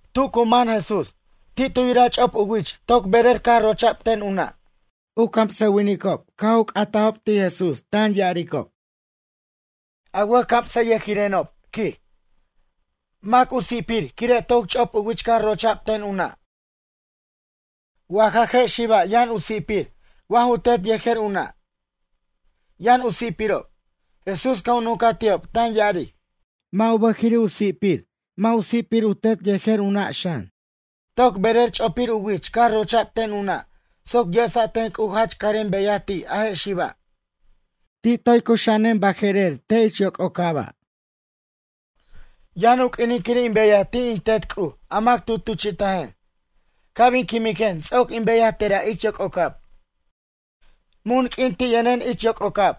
Tu cu man Jesús, ti' tu yiraj ch'op u wich toc berer caj rocha'b ten u na'. U camsʌwinicob caj u c'atajob ti' Jesús tan ya'aricob: ―A wʌjcamsʌyʌjirenob ―quij―. Mac u si'pir quire' toc ch'op u wich caj rocha'b ten u na'? Wa ja je' xiba' yʌn u si'pir wa ju tet yejer u na', yʌn u si'pirob? Jesús caj u nuncaj ti'ob tan ya'aric: ―Mʌ' u bʌjiri' u si'pir, mʌ' u si'pir u tet yejer u na' xan. Toc berer ch'opir u wich caj rocha'b ten u na' soc yesa' ten C'uj jach carem beyaj ti' a je' xiba'. Ti' toy cuxa'anen baje'rer te' ich yoc'ocaba'. Yʌn u q'uinin quir in beyaj ti' in Tet C'uj a mac tu tuchi'tajen. Ca' bin quimiquen ts'oc in beyaj tera' ich yoc'ocab. Mun q'uin ti' yʌnen ich yoc'ocab,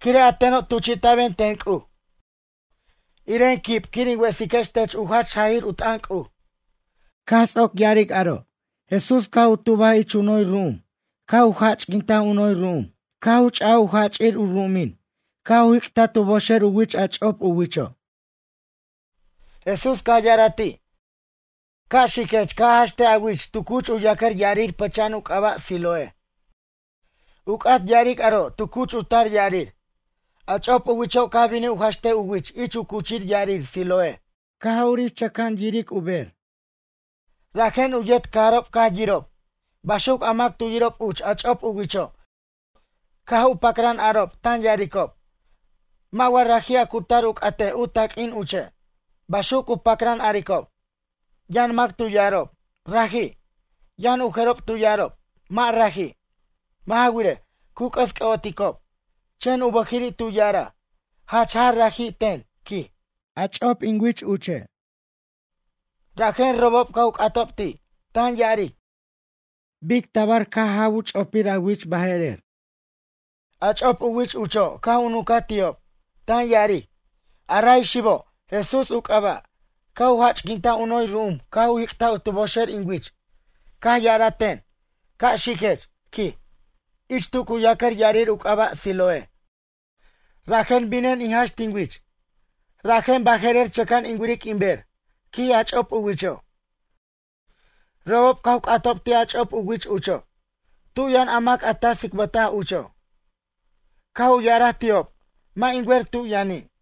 quire' a teno' tuchi'taben ten C'uj, iren quib quir in wesiquex tech u jach jajir u t'ʌn C'uj. Caj ts'oc ya'aric aro' Jesús caj u tubaj ich u noy ru'um caj u jach'quintaj u noy ru'um caj u ch'aj u jach'ir u ru'umin caj u jic'taj tu boxer u wich a ch'op u wicho'. Jesús caj ya'araj ti': ―Ca' xiquech ca' a ja'xtej a wich tu cuch u yacʌr ya'arir pʌcha'an u c'aba' Siloé ―u c'at ya'aric aro' tu cuch u tar ya'arir. A ch'op u wicho' caj binij u ja'xtej u wich ich u cuch ya'arir Siloé caj urij chʌca'an yiric u bej. Rajen u yet cajarob caj yirob. Baxuc a mac tu yirob uch a ch'op u wicho' caj u pacran arob tan ya'aricob: ―Mʌ' wa raji' a cu cutar u c'atej u taq'uin uche'? ―baxuc u pacran aricob. Yʌn mac tu ya'arob: ―Raji'. Yʌn u jerob tu ya'arob: ―Mʌ' raji'. Mʌ' ja wirej, cu c'ʌs c'ʌ'oticob. Chen u bʌjiri' tu ya'araj: ―Jach jaj raji' ten ―quij―, a ch'op in wich uche'. Rajen robob caj u c'atob ti', tan ya'aric: ―Bic tabar caj jaw u ch'opir a wich baje'rer? A ch'op u wich ucho' caj u nuncaj ti'ob, tan ya'aric: ―A ray xibo', Jesús u c'aba', caj u jach'quintaj u noy ru'um caj u jic'taj tu boxer in wich. Caj ya'araj ten: “Ca' xiquech, quij, ich tu cu yacʌr ya'arir u c'aba' Siloé.” Rajen binen in jax tin wich. Rajen baje'rer chʌca'an in wiric in ber ―quij a ch'op u wicho'. Robob caj u c'atob ti' a ch'op u wich ucho'. ―Tu' yʌn a mac a ta tsicbʌtaj ucho'? Caj u ya'araj ti'ob: ―Mʌ' in wer tu' yʌni'.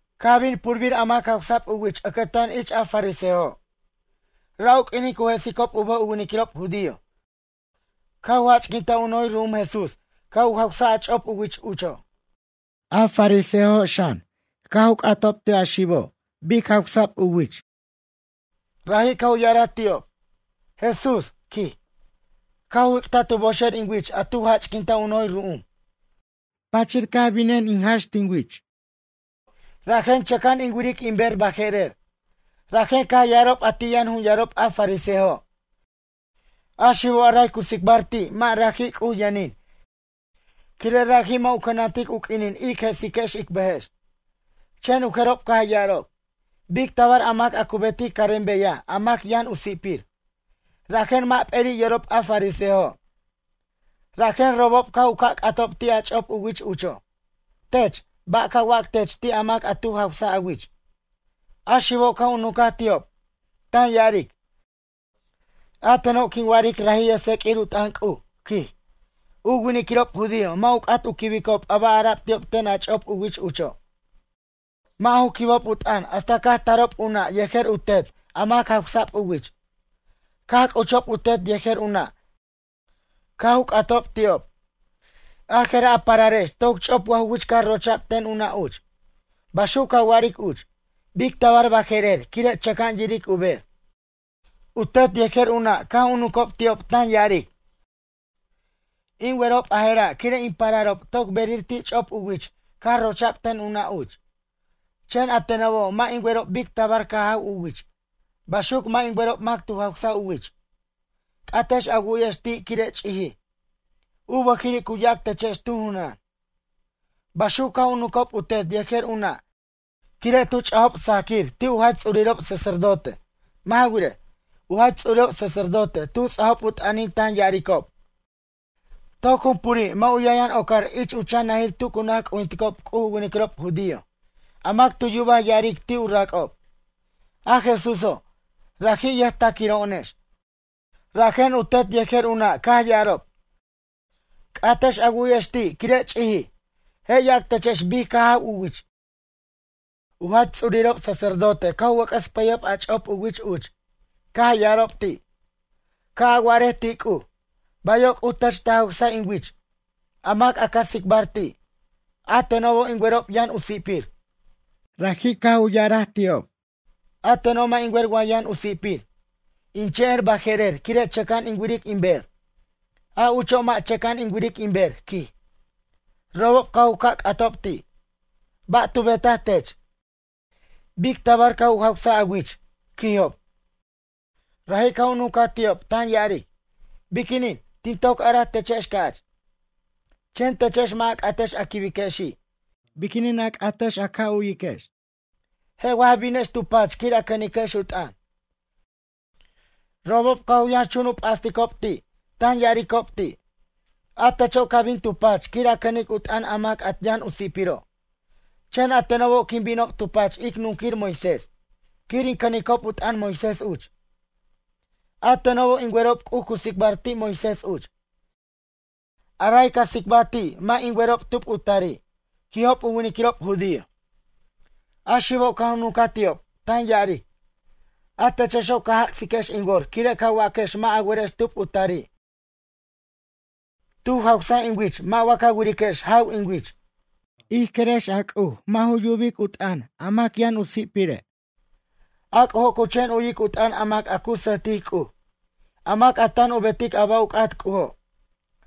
Caj bin purbir a mac jawsa'b u wich ʌcʌtan ich a fariseojo'. Ra' u q'uinin cu jesicob u bʌj u winiquirob judío caj u jach'quintaj u noy ru'um Jesús caj u jawsaj a ch'op u wich ucho'. A fariseojo' xan caj u c'atob ti' a xibo' bic jawsa'b u wich. Raji' caj u ya'araj ti'ob: ―Jesús ―quij―, caj u jic'taj tu boxer in wich a tu jach'quintaj u noy ru'um. Pachir caj binen in ja'x tin wich, rajen chʌca'an in wiric in ber baje'rer. Rajen caj ya'arob a ti' yʌn jun yarob a fariseojo': ―A xibo' a ray ca tsicbar ti' mʌ' raji' C'uj yʌnin quire' raji' mʌ' u cʌnantic u q'uinin ic jesiquex ic bʌjex. Chen u jerob caj ya'arob: ―Bic tabar a mac a cu betic carem beyaj a mac yʌn u si'pir? Rajen mʌ' p'eri' yorob a fariseojo'. Rajen robob caj u ca' c'atob ti' a ch'op u wich ucho'. Tech, ba' ca wac tech ti' a mac a tu jawsaj a wich? A xibo' caj u nuncaj ti'ob, tan ya'aric: ―A teno' quin wa'aric raji' yʌjtseq'uir u t'ʌn C'uj ―quij. U winiquirob judío mʌ' u c'at u quibicob a ba' ara'b ti'ob ten a ch'op u wich ucho'. Mʌ' ju quibob u t'ʌn hasta caj tarob u na' yejer u tet a mac jawsa'b u wich. Caj c'uchob u tet yejer u na' caj u c'atob ti'ob: ―A je'ra' a pararex toc ch'op wa ju wich caj rocha'b ten u na' uch? Baxuc ca wa'aric uch? Bic tabar baje'rer quire' chʌca'an yiric u ber? U tet yejer u na' caj u nuncob ti'ob tan ya'aric: ―In werob a jera' quire' in pararob toc berer ti' ch'op u wich caj rocha'b ten u na' uch. Chen a tenobo' mʌ' in werob bic tabar caj jaw u wich. Baxuc mʌ' in werob mac tu jawsaj u wich. C'atex a wu'yej ti' quire' ch'ijij, u bʌjiri' cu yac techex tu junan. Baxuc caj u nuncob u tet yej u na' quire' tu ch'ajob sajquir ti' u jach ts'urirob sacerdote. Mʌ' ja wirej, u jach ts'urirob sacerdote tu ts'ajob u t'ʌnin tan ya'aricob: “Toc jumpuri' mʌ' u yʌnyʌn ocar ich u chan najir tu cu naj c'ujinticob C'uj u winiquirob judío, a mac tu yubaj ya'aric ti' u rac'ob: A Jesúso', raji' yʌjtaquiro'onex.” Rajen u tet yejer u na' caj ya'arob: “C'atex a wu'yex ti' quire' ch'ijij. Je' yac techex bic caj jaw u wich.” U jach ts'urirob sacerdote caj u wʌc'ʌs pʌyob a ch'op u wich uch, caj ya'arob ti': ―Ca' a wa'arej ti' C'uj: “Bayo' C'uj tech ta jawsaj in wich.” A mac a ca tsicbar ti', a tenobo' in werob yʌn u si'pir. Raji' caj u ya'araj ti'ob: ―A teno' mʌ' in wer wa yʌn u si'pir. In chen er baje'rer quire' chʌca'an in wiric in ber. A ucho' mʌ' chʌca'an in wiric in ber ―quij. Robob caj u ca' c'atob ti': ―Ba' tu betaj tech? Bic tabar caj u jawsaj a wich? ―quijob. Raji' caj u nuncaj ti'ob tan ya'aric: ―Biquinin tin toc araj techex ca'ch? Chen techex mʌ' a c'atex a quibexi'. Biquinin a c'atex a ca' u'yiquex, je' wa ja binex tu pach quir a cʌniquex u t'ʌn? Robob caj u yʌnxchun u p'asticob ti' tan ya'aricob ti': ―A techo' ca bin tu pach quir a cʌnic u t'ʌn a mac a yʌn u si'piro'. Chen a tenobo' quin binob tu pach ic nunquir Moisés quir in cʌnicob u t'ʌn Moisés uch. A tenobo' in werob C'uj cu tsicbar ti' Moisés uch. A ray ca tsicba ti' mʌ' in werob tub u tari' ―quijob u winiquirob judío. A xibo' caj u nuncaj ti'ob, tan ya'aric: ―A techexo' ca jac'siquex in wor quire' ca waquex mʌ' a werex tub u tari'. Tu jawsaj in wich mʌ' wa ca wiriquex jaw in wich. Ij querex a C'uj mʌ' ju yubic u t'ʌn a mac a yʌn u si'pire'. A C'ujo' cu chen u'yic u t'ʌn a mac a cu sʌjtic C'uj, a mac a tan u betic a ba' u c'at C'ujo'.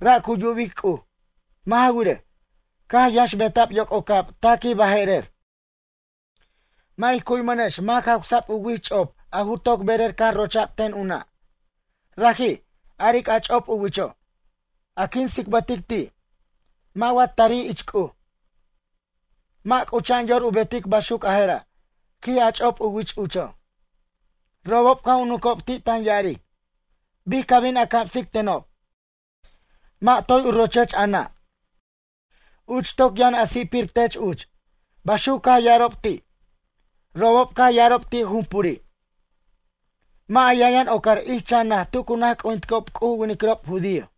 Ra' cu yubic C'uj. Mʌ' ja wirej, caj yʌnxbeta'b yoc'ocab taquij baje'rer, mʌ' ij cu'yimʌnex mac jawsa'b u wich ch'op a ju toc berer caj rocha'b ten u nʌ' ―raji', aric a ch'op u wicho'―. A quin tsicbʌtic ti', wa mʌ' tarij ich C'uj, mʌ' c'ucha'an yor u betic baxuc a jera' ―quij a ch'op wich ucho'. Robob caj u nuncob ti' tan ya'aric: ―Bic ca bin a camsic tenob? Mʌ' toy u rochech a na', uch toc yʌn a si'pir tech uch ―baxuc caj ya'arob ti'. Robob caj ya'arob ti' jumpuri': ―Mʌ' a yʌnyʌn ocar ich chan naj tu cu naj c'ujinticob C'uj u winiquirob judío.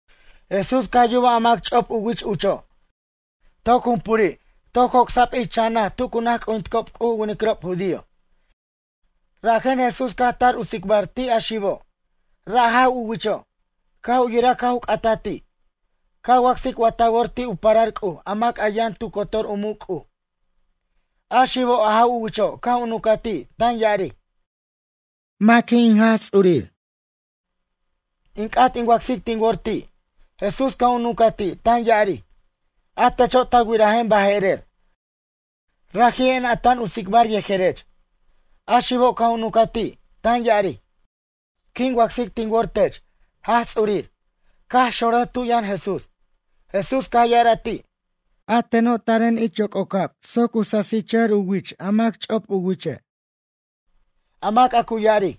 Jesús caj yubaj a mac ch'op u wich ucho', toc jumpuri' toc joc'sa'b ich chan naj tu cu naj c'ujinticob C'uj u winiquirob judío. Rajen Jesús caj tar u tsicbar ti' a xibo', ra' jaw u wicho'. Caj u yiraj caj u c'ataj ti': ―Ca wacsic wa ta wor ti' u parar C'uj a mac a yʌn tu cotor u muc' C'uj? A xibo' a jaw u wicho' caj u nuncaj ti' tan ya'aric: ―Maqui' in Jaj Ts'urir? In c'at in wacsic tin wor ti'. Jesús caj u nunca ti' tan ya'aric: ―A techo' ta wirajen baje'rer. Raji'en a tan u tsicbar yejerech. A xibo' caj u nuncaj ti', tan ya'aric: ―Quin wacsic tin wor tech, Jaj Ts'urir. Caj xonrʌj tu' yʌn Jesús. Jesús caj ya'araj ti': ―A teno' taren ich yoc'ocab soc u sasichʌjʌr u wich a mac ch'op u wiche'. A mac a cu ya'aric: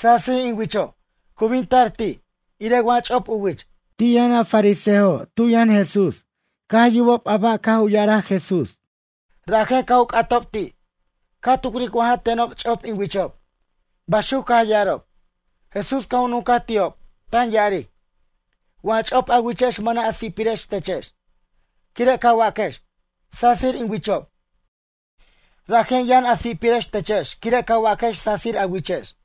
“Sasij in wicho'”, cu bin tar ti', irej wa ch'op u wich. Ti' yʌn a fariseojo' tu' yʌn Jesús caj yubob a ba' caj u ya'araj Jesús. Rajen caj u c'atob ti': ―Ca tucric wa ja tenob ch'opob in wichob ―baxuc caj ya'arob. Jesús caj u nuncaj ti'ob, tan ya'aric: ―Wa ch'op a wichex mʌna' a si'pirex techex. Quire' ca waquex: “Sasir in wichob”, rajen yʌn a si'pirex techex quire' ca waquex sasir a wichex.